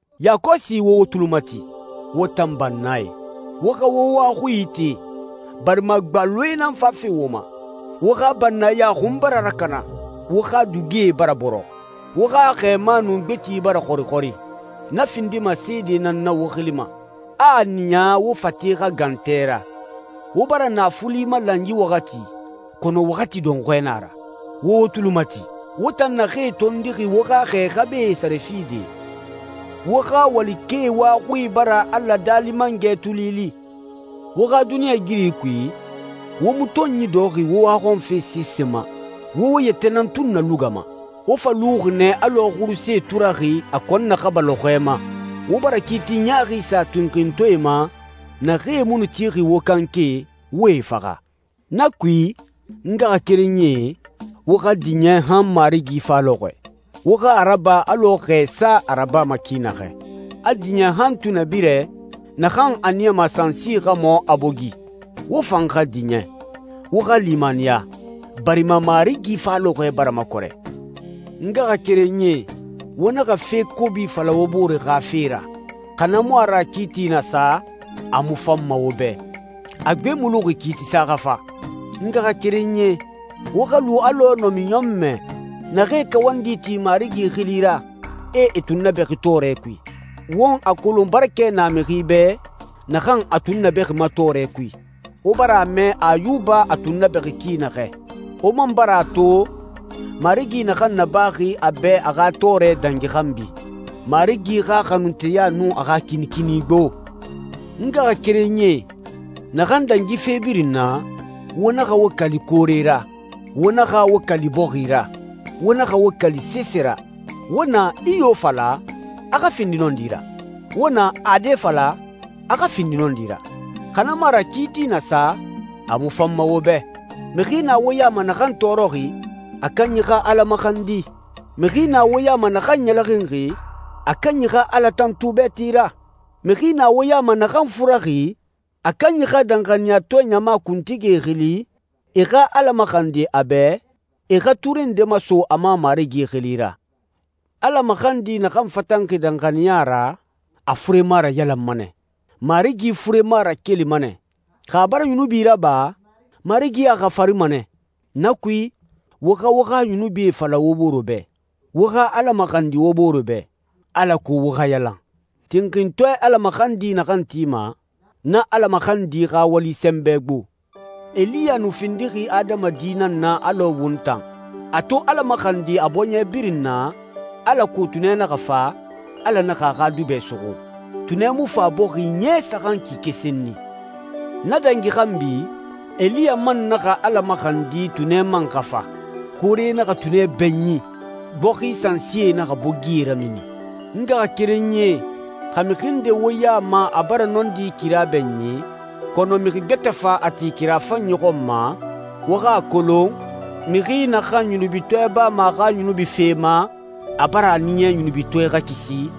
Yakɔsi wo wo tuli mati, wo tan bannae. Wo xa wo wa xui ite, barima gbaloe nan fafe wo ma. Wo xa bannaya xun bara rakana, wo xa dugie bara bɔrɔ. Wo xa xɛɛma nun gbeti bara xɔrixɔri. Na findima seede nan na wo xili ma, a a niya wo fate xa gan tɛ ra. Wo bara naafuli malan yi waxati, kɔnɔ waxati dɔnxɔɛ na a ra. Wo wo tuli mati, wo tan naxee tondixi wo xa xɛ xabae sare fide. Wo xa walikɛe wa xui bara Ala, Daali Mangɛ, tuli li. Wo xa duniɲɛigiri kui, wo mu tɔnyi dɔxɔxi wo waxɔnfe sese ma. Wo wo yɛtɛ nan tun nalugama. Wo fa luxi nɛ alɔ xuruse turaxi a kɔn naxaba lɔxɔɛ ma. Wo bara kiiti ɲaaxi sa tinxintɔɛe ma naxee mu nu tixi wo kanke, wo e faxa. Na kui, n ngaxakerenyie, wo xa diɲɛ han Marigi fa lɔxɔɛ. Wo xa a raba alɔ xɛsa a rabama ki naxɛ. A diɲɛ han tunɛbirɛ, naxan a niyama sansi xa mɔ, a bogi. Wo fan xa diɲɛ. Wo xa limaniya, barima Marigi fa lɔxɔɛ bara makɔrɛ. N ngaxakerenyie, wo naxa fe kobi fala wo bore xa fe ra, xa na mu a ra kiiti na sa, a mu fanma wo bɛ. A gbe mu luxi kiitisa xa fa. N ngaxakerenyie, wo xa lu alɔ namiɲɔnmɛ naxee kawandi ti Marigi xili ra, e e tunnabɛxi tɔɔrɛ kui. Won a kolon barakɛ na mixi bɛ naxan a tunnabɛxima tɔɔrɛ kui. Wo bara a mɛ Ayuba a tunnabɛxi ki naxɛ. Wo man bara a to Marigi naxan nabaxi a bɛ a xa tɔɔrɛ dangi xanbi. Marigi xa xanunteya nun a xa kinikini gbo. N ngaxakerenyie, naxan dangi fe birin na, wo naxa wo kali koore ra, wo naxa wo kali bɔxi ra, wo naxa wo kali sese ra. Wo na «iyo» fala, a xa findi nɔndi ra. Wo na «ade» fala, a xa findi nɔndi ra. Xa na mu a ra kiiti na sa, a mu fanma wo bɛ. Mixi na wo ya ma naxan tɔɔrɔxi? A kanyi xa Ala maxandi. Mixi na wo ya ma naxan ɲɛlɛxinxi? A kanyi xa Ala tantu bɛɛti ra. Mixi na wo ya ma naxan furaxi? A kanyi xa danxaniyatɔɛ ɲama kuntigie xili, e xa Ala maxandi a bɛ, e xa ture nde maso a ma Marigi xili ra. Ala maxandi naxan fatanxi danxaniya ra, a furema rayalanma nɛ. Marigi furema rakelima nɛ. Xa a bara yunubi raba, Marigi a xafarima nɛ. Na kui, wo xa wo xa yunubie fala wo bore bɛ, wo xa Ala maxandi wo bore bɛ, alako wo xa yalan. Tinxintɔɛ Ala maxandi naxan tima, na Ala maxandi xa wali sɛnbɛ gbo. Eliya nu findixi adamadi nan na alɔ won tan. A to Ala maxandi a bɔɲɛ birin na alako tunɛ naxa fa, Ala naxa a xa dubɛ suxu. Tunɛ mu fa bɔxi ɲɛ saxan kike senni. Na dangi xanbi, Eliya man naxa Ala maxandi tunɛ man xa fa. Koore naxa tunɛ bɛɲin, bɔxi sansie naxa bogie ramini. N ngaxakerenyie, xa mixi nde wo ya ma a bara nɔndi kira bɛɲin, kɔnɔ mixi gbɛtɛ fa a ti kira fanyi xɔn ma, wo xa a kolon, mixi naxan yunubitɔɛ bama a xa yunubi fe ma, a bara a niya yunubitɔɛ xa kisi,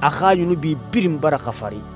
a xa yunubi birin bara xafari.